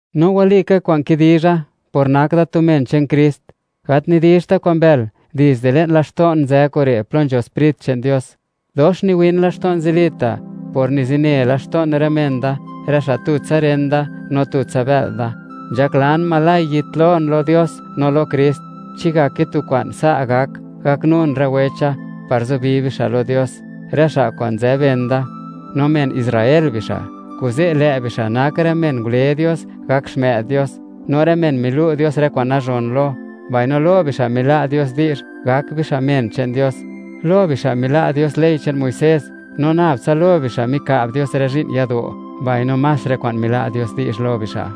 No walika kwa'n kidizha; por nak da tu men che'n Krist, gat nidizhta' kwa'n mbël; dizde le'n laxto'n nzë kure' plo nzho Sprit che'n Dios. Dox niwin laxto'n zilita', por nizine laxto'n rë men da, rë xa' tutsa ren da, no tutsa bë'l da. Nzhaklan, oj yitlon lo Dios no lo Krist, chi ngake tu kwa'n, sa' gak gaknun rë wecha par zubi bixa' lo Dios, rë xa' kwa'n nzë ben da, no men Israel bixa'; kuze' lë' bixa' nak rë men ngule Dios gak xmë'd Dios, no rë men milu' Dios rë kwa'n nazhon lo, mbaino lo bixa' mila' Dios di'zh gak bixa' men che'n Dios. Lo bixa' mila' Dios ley che'n Muisés, no nab tsa lo bixa' mika'b Dios rë zhi'n yado', mbaino más rë kwa'n mila' Dios di'zh lo bixa'.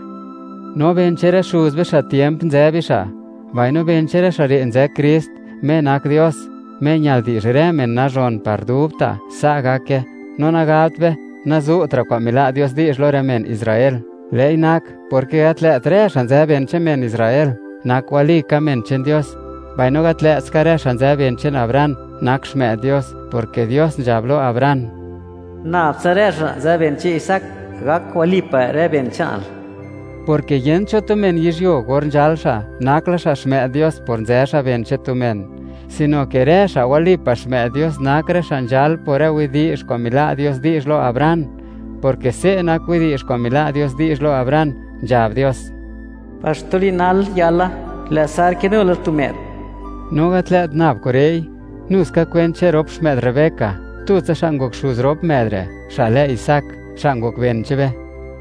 No ben che'n rë xuz be, xa' tiemp, nzë bixa'; mbaino ben che'n rë xa' re' nzë Krist, Me nak Dios, Me ñal di'zh rë men nazhon par dubta'. Sa' gake. No nagabt be, nazu'tra' kwa'n mila' Dios di'zh lo rë men Israel; lë'i nak, porke gat lë't rë xa' nzë ben che'n men Israel, nak walika men che'n Dios. Mbaino gat lë't ska rë xa' nzë ben che'n Abraham nak xmë'd Dios, porke Dios nzhab lo Abraham: “Nabtsa rë xa' nzë ben che'n Isaac gak walipa' rë ben che'nal”, porke yent cho tu men yizhyuo, or nzhal xa', nak la xa' xmë'd Dios por nzë xa' ben che'n tu men, sino ke rë xa' walipa' xmë'd Dios nak rë xa' nzhal por rë widi'zh kwa'n mila' Dios di'zh lo Abraham, porke se' nak widi'zh kwa'n mila' Dios di'zh lo Abraham, nzhab Dios: “Par xtu li'n nal yala, lë' Sar kinu la tu më'd.” No gat lë't nab kure'i, nu ska kwent che'n rop xmë'd Rebeca, tutsa xa' ngok xuz rop më'd re', xa' lë Isaac, xa' ngok ben che'n be.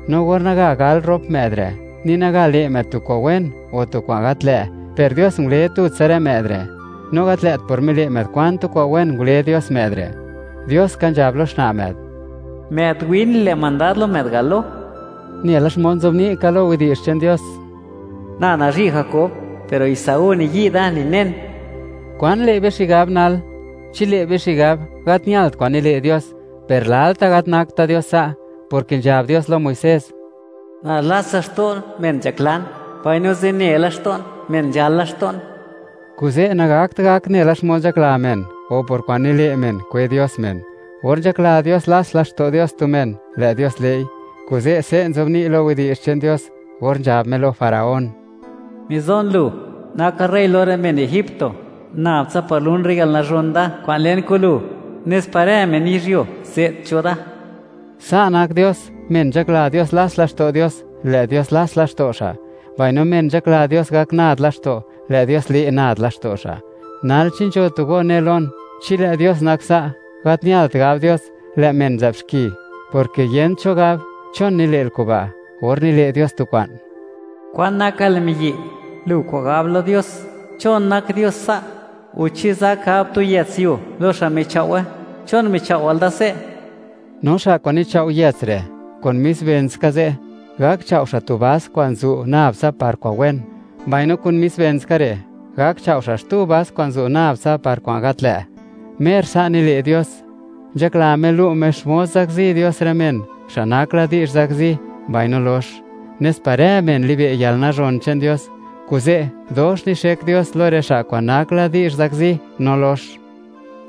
No or naga gal rop më'd re', ni naga le' më'd tu kwa'n wen o tu kwa'n gat lë', per Dios ngule tutsa rë më'd re', no gat lë't por mile' më'd kwan tu kwa'n wen ngule Dios më'd re'. Dios ka nzhab lo xna' më'd: “Më'd win le' mandad lo më'd galo.” Nela xmod nzobni' ka lo Yech che'n Dios: “Na nazhi' Jakob, per Esaú niyi' da ninen.” ¿Kwan le' be xigab nal? ¿Chi le' be xigab: “Gat ñalt kwa'n nile' Dios”? ¡Per lalta' gat nakta' Dios sa'!, porke nzhab Dios lo Muisés: Na lats laxto' men nzhaklan, mbaino zine laxto'n men nzhal laxto'n. Kuze' nagakt gak nela xmod nzhakla men, o por kwa'n nile' men kwe Dios men; or nzhakla Dios lats laxto' Dios tu men, lë' Dios le'i. Kuze', se' nzobni' lo Yech che'n Dios or nzhab Me lo Faraón: “Mizon lu, nakal rey lo rë men egipto, nab tsa par lun rë yalnazhon Da kwa'n len kun lu, nes par rë men yizhyuo ze't cho Da.” Sa' nak Dios, men nzhakla Dios lats laxto' Dios, lë' Dios lats laxto' xa'; mbaino men nzhakla Dios gak nad laxto', lë' Dios le' nad laxto' xa'. Nal, chi nzho tu go ne lon: “Chi lë' Dios nak sa', gat ñalt gab Dios, lë' men nzë'b xki, porke yent cho gab, ¿chon nile'l kuba'?, or nile' Dios tu kwa'n.” ¿Kwan nakal, miyi'?, lu kwa'n gab lo Dios: “¿Chon nak Dios sa'?” O, ¿chi zak gab tu yëts yuo lo xa' michao'we?: “¿Chon michao'wal da se'?” No xa' kwa'n nichao' yëts re', kun mis ben ska ze' gak chao' xa' tu vas kwa'n zu' nab tsa par kwa'n wen, mbaino kun mis ben ska re', gak chao' xa' xtu vas kwa'n zu' nab tsa par kwa'n gat lë'. Mer sa' nile' Dios. Nzhakla Me lu' Me xmod zakzi Dios rë men xa' nak la di'zh zakzi mbaino lox, nes par rë men libe' yalnazhon che'n Dios. Kuze', dox nixek Dios lo rë xa' kwa'n nak la di'zh zakzi no lox.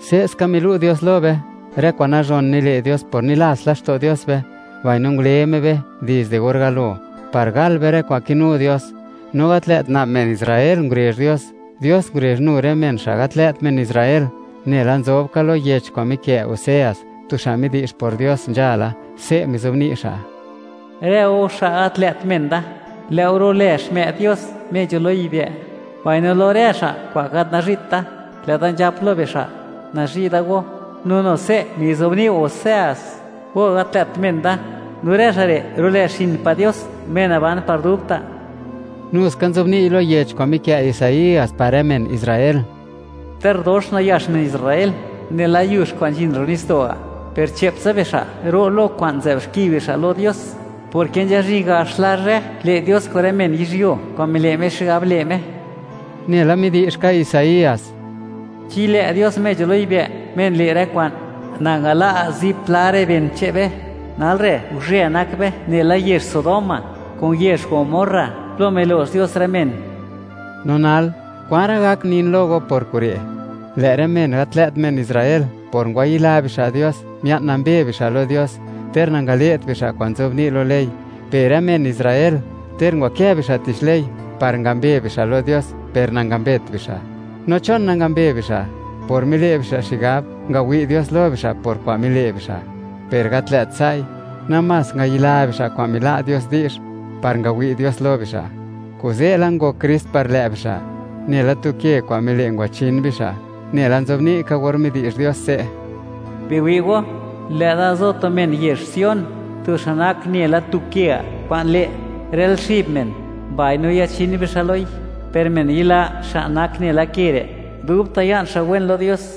Se'ska milu' Dios lo be, rë kwa'n nazhon nile' Dios por nilats laxto' Dios be, mbaino ngule Me be dizde or galo par gal be rë kwa'n kinu Dios. No gat lë't nab men Israel ngurezh Dios; Dios ngurezh nu rë men xa' gat lë't men Israel. Nela nzobni' ka lo yech kwa'n mikë' Oseas, tu xa' midi'zh por Dios nzhala, se' mizobni' xa': Rë go xa' gat lë't men Da, lë' go ru'lë xmë'd Dios, Me nzho lo yibë'; mbaino lo rë xa' kwa'n gat nazhi't da, lë'da nzhap lo bixa': “Nazhi' da go.” No nu se' mizobni' Oseas: “Go, gat lë't men Da”, no rë xa' re' ru'lë, xin pa' Dios, Me naban par dubta'. Nuska nzobni'y lo yech kwa'n mikë' Isaías par rë men Israel: Ter dox nayax men Israel, nela yux kwa'n nzhin ro' nitsdo' ga', Per che'ptsa bixa' ro' lo kwa'n nzë'b xki bixa' lo Dios; porke nzhazhin gax la zhë, le' Dios kun rë men yizhyuo kwa'n mile' Me xigab le' Me. Nela midi'zh ska Isaías: Chi lë' Dios Me nzho lo yibë', Me nile' rë kwa'n, nangala' zipla rë ben che'n be. Nal re' guzhë nak be nela yezh Sodoma kun yezh Gomorra, plo milo'x Dios rë men. No nal, ¿kwan ra' gak nin lo go por kure'? Lë' rë men gat lë't men Israel, por ngwayila bixa' Dios, mia'n nambe bixa' lo Dios ter nangale't bixa' kwa'n nzobni' lo ley; per rë men Israel, ter ngwakë bixa' tich ley par ngambe bixa' lo Dios, per nangambet bixa'. ¿No chon nangambe bixa'? Por mile' bixa' xigab, ngawi' Dios lo bixa' por kwa'n mile' bixa'. Per gat lë't sa'i, namás ngayila bixa' kwa'n mila' Dios di'zh par ngawi' Dios lo bixa'. Kuze' la ngok Krist par lë' bixa', nela tu ke kwa'n mile' ngwachin bixa'. Nela nzobni' ka, or midi'zh Dios se': Biwi' go, lë'da zo tu men yezh Sion, tu xa' nak nela tu ke ga' kwa'n le', rël xib men, mbaino yachin bixa' loi. Per men yila xa' nak nela ke re', dubta' ya'n xa' wen lo Dios.